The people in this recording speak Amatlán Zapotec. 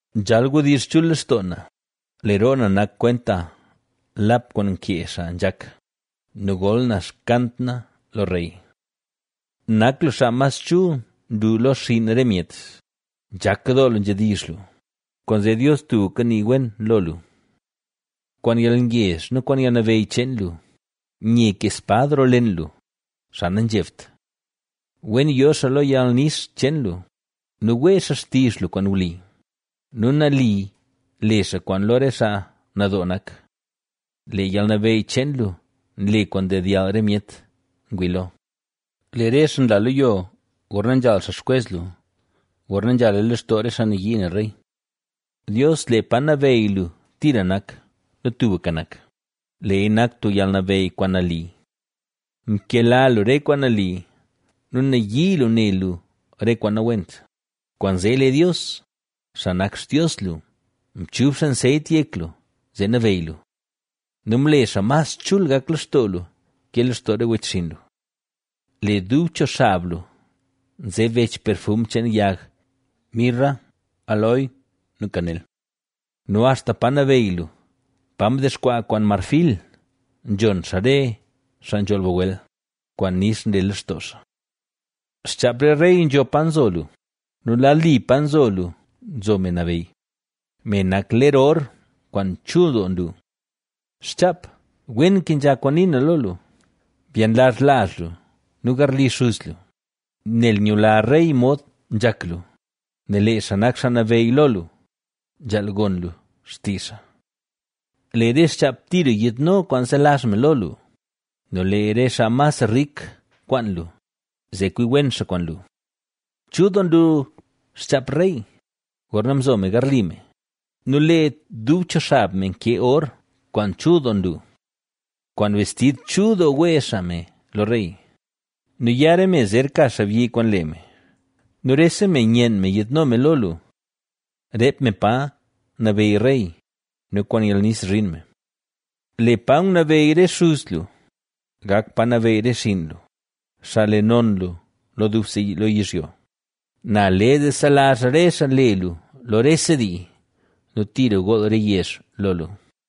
Nzhal wdizh chul lextoo na; lee roo na nak kwenta lap kwaan nkee xaa nzhak nu gol na xkant na lo rey. Nak lu xaa mas chul nlu lo xinn re myet, Nzhak doo lu nzhedizh lu, kwaanzee Dios tubka nii wen lo lu. Kwaan yalngezh nu kwaan yalnabeyy cheen lu, nye kee spad roo len lu, xaa nanzhebt. Wen yo xaa lo yalnix cheen lu nu wee xaa xtizh lu kwaan wli nu nali le xaa kwaan lo re xaa nadoo nak. Lee yalnabeyy cheen lu nle kwaan ndedyall re myet ngwii lo. Lee re xaa nla lo yo gorna nzhal xaa xkwez lu, gorna nzhala lextoo re xaa nayii ne rey. Dios, lee pa nabeyy lu tira nak nu tubka nak, leeya nak tub yalnabeyy kwaan nali. Mkela lu re kwaan nali nu nayii lu ne lu re kwaan nawent; kwaanzee lee Dios, xaa nak Xtios lu, mchub xaa nseyt yek lu, zee nabeyy lu nu mle xaa mas chul gak lextoo lu ke lextoo re wechxinn lu. Lee dub cho xab lu nze bech perfum cheen yag mirra, aloe nu kanel nu axta pa nabeyy lu, pa ndexkwaa kwaan marfil, nzhon xaa re xaa nzholl bagwel, kwaan nix nle lextoo xaa. Xchaap re rey nzho pa nzo lu nu lad li pa nzo lu, nzo me nabeyy, me nak ler or kwaan chul doo nlu. ¡Xchaap, wen kenzha kwaan nii na lo lu! Byenlazh lazh lu nu garli xuz lu, nel nyula rey mod nzhak lu, nel lee xaa nak xaa nabeyy lo lu, nzhaal gon lu xtizh xaa. Lee re xchaap Tiro yiidno kwaan zelazh me lo lu, nu lee re xaa mas rik kwaan lu, zee kwi wen xaa kwaan lu. Chul doo nlu xchaap rey, gorna nzo me garli me nu lee dub cho xab me nke or kwaan chul doo nlu. Kwaan bestid chul doo wee xaa me lo rey nu ya re me zer ka xaabyi kwaan lee me nu rese me nyen me yiidno me lo lu. Reep me pa nabeyy rey nu kwaan yalnix zhin me. Lee pa ngunabeyy re xey lu, gak pa nabeyy re xinn lu, xaa le non lu lo dubse lo yizhyo, Na le zee selazh re xaa le lu lo rese dii nu tira gool re yezh lo lu.